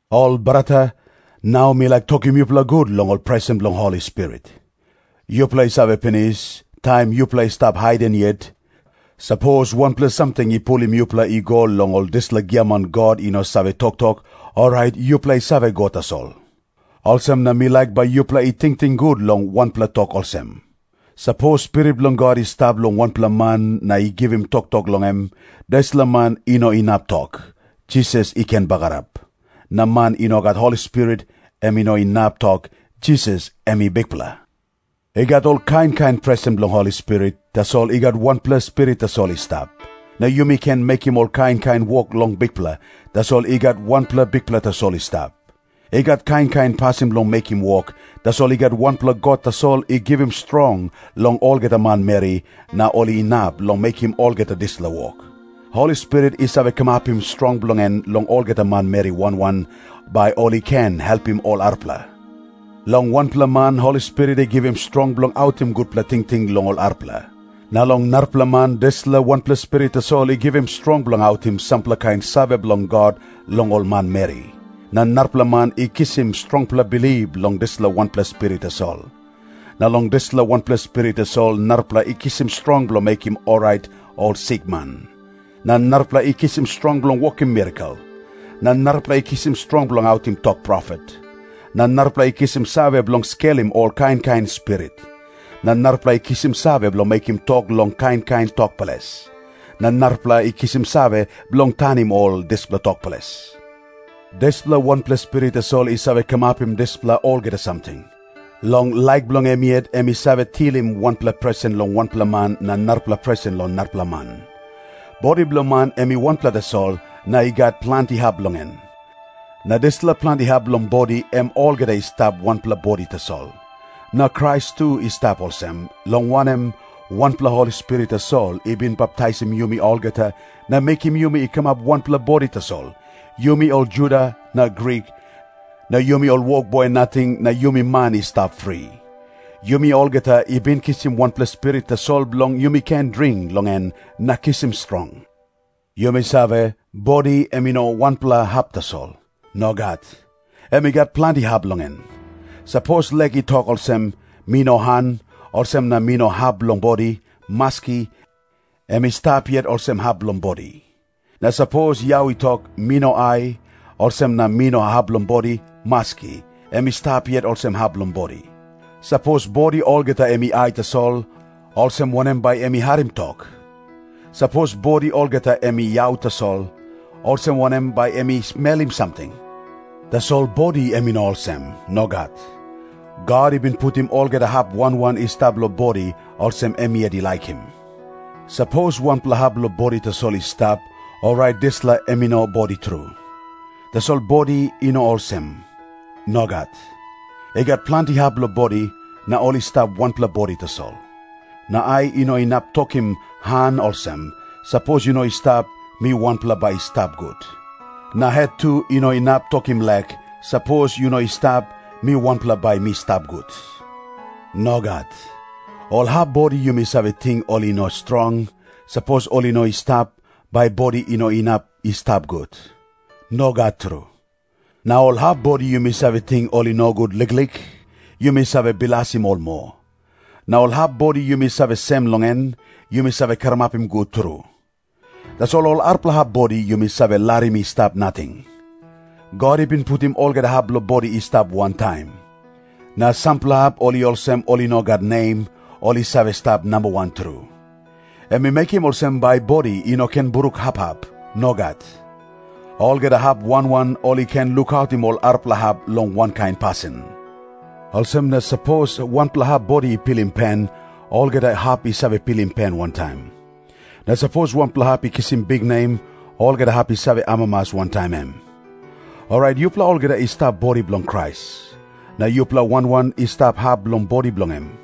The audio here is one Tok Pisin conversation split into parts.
Ol brata, nau mi laik tokim yupela gut long ol presen bilong Holi Spirit. Yupela i save pinis, taim yupela i stap haiden yet, sapos wanpela samting i pulim yupela i go long ol dispela giaman god i no save toktok, orait yupela i save go tasol. Olsem na mi laik bai yupela i tingting gut long wanpela tok olsem. Sapos Spirit bilong God i stap long wanpela man na i givim toktok long em, dispela man i no inap tok, “Jisas i ken bagarap.” Na man i no gat Holi Spirit, em i no inap tok, “Jisas em i Bikpela.” I gat ol kain kain presen bilong Holi Spirit, tasol i gat wanpela Spirit tasol i stap. Na yumi ken mekim ol kain kain wok long Bikpela, tasol i gat wanpela Bikpela tasol i stap. I gat kain kain pasin bilong mekim wok, tasol i gat wanpela God tasol i givim strong long olgeta manmeri, na ol inap long mekim olgeta dispela wok. Holi Spirit i save kamapim strong bilong en long olgeta manmeri wan wan, bai ol i ken helpim ol arapela. Long wanpela man Holi Spirit i givim strong bilong autim gutpela tingting long ol arapela. Na long narapela man dispela wanpela Spirit tasol i givim strong bilong autim sampela kain save bilong God long ol manmeri. Na narapela man i kisim strongpela bilip long dispela wanpela Spirit tasol. Na long dispela wanpela Spirit tasol narapela i kisim strong bilong mekim orait ol sikman. Na narapela i kisim strong bilong wokim mirakel. Na narapela i kisim strong bilong autim tok profet. Na narapela i kisim save bilong skelim ol kain kain spirit. Na narapela i kisim save bilong mekim tok long kain kain tok ples. Na narapela i kisim save bilong tanim ol dispela tok ples. Dispela wanpela Spirit tasol i save kamapim dispela olgeta samting. Long laik bilong em yet em i save tilim wanpela presen long wanpela man na narapela presen long narapela man. Bodi bilong man em i wanpela tasol, na i gat planti hap bilong en. Na dispela planti hap bilong bodi em olgeta i stap wanpela bodi tasol. Na Krais tu i stap olsem, long wanem, wanpela Holi Spirit tasol i bin baptaisim yumi olgeta na mekim yumi i kamap wanpela bodi tasol, yumi ol Juda na Grik, na yumi ol wokboi nating na yumi man i stap fri. Yumi olgeta i bin kisim wanpela Spirit tasol bilong yumi ken dring long en na kisim strong. Yumi save, bodi em i no wanpela hap tasol. Nogat. Em i gat planti hap bilong en. Sapos lek i tok olsem, “Mi no han, olsem na mi no hap bilong bodi,” maski, em i stap yet olsem hap bilong bodi. Na sapos yau i tok, “Mi no ai, olsem na mi no hap bilong bodi,” maski, em i stap yet olsem hap bilong bodi. Sapos bodi olgeta em i ai tasol, olsem wanem bai em i harim tok? Sapos bodi olgeta em i yau tasol, olsem wanem bai em i smelim samting? Tasol bodi em i no olsem. Nogat. God i bin putim olgeta hap wan wan i stap long bodi, olsem em yet i laikim. Sapos wanpela hap bilong bodi tasol i stap, orait dispela em i no bodi tru. Tasol bodi i no olsem. Nogat. I gat planti hap bilong bodi, na ol i stap wanpela bodi tasol. Na ai i no inap tokim han olsem, “Sapos yu no i stap, mi wanpela bai mi stap gut.” Na het tu i no inap tokim lek, “Sapos yu no i stap, mi wanpela bai mi stap gut.” Nogat. Ol hap bodi yumi save ting ol i no strong, sapos ol i no i stap, bai bodi i no inap i stap gut. Nogat tru. Na ol hap bodi yumi save ting ol i nogut liklik, yumi save bilasim ol moa. Na ol hap bodi yumi save sem long en, yumi save karamapim gut tru. Tasol ol arapela hap bodi, yumi save larim i stap nating. God i bin putim olgeta hap bilong bodi i stap wantaim. Na sampela hap ol i olsem ol i no gat nem, ol i save stap nambawan tru. Em i mekim olsem bai bodi i no ken bruk hap hap. Nogat. Olgeta hap wan wan ol i ken lukautim ol arapela hap long wankain pasin. Olsem na sapos wanpela hap bodi i pilim pen, olgeta hap i save pilim pen wantaim. Na sapos wanpela hap i kisim biknem, olgeta hap i save amamas wantaim em. Orait yupela olgeta i stap bodi bilong Krais. Na yupela wan wan i stap hap bilong bodi bilong em.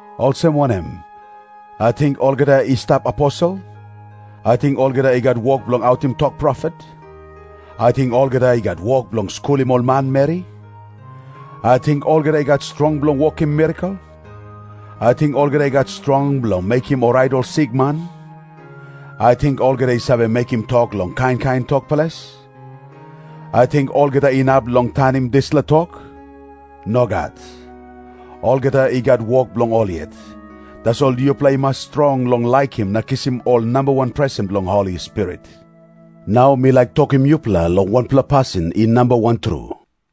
Olsem wanem? Ating olgeta i stap aposel? Ating olgeta i gat wok bilong autim tok profet? Ating olgeta i gat wok bilong skulim ol manmeri? Ating olgeta i gat strong bilong wokim mirakel? Ating olgeta i gat strong bilong mekim orait ol sikman? Ating olgeta i save mekim tok long kain kain tok ples? Ating olgeta inap long tanim dispela tok? Nogat. Olgeta i gat wok bilong ol yet. Tasol yupela i mas strong long laikim na kisim ol nambawan presen bilong Holi Spirit. Nau mi laik tokim yupela long wanpela pasin i nambawan tru.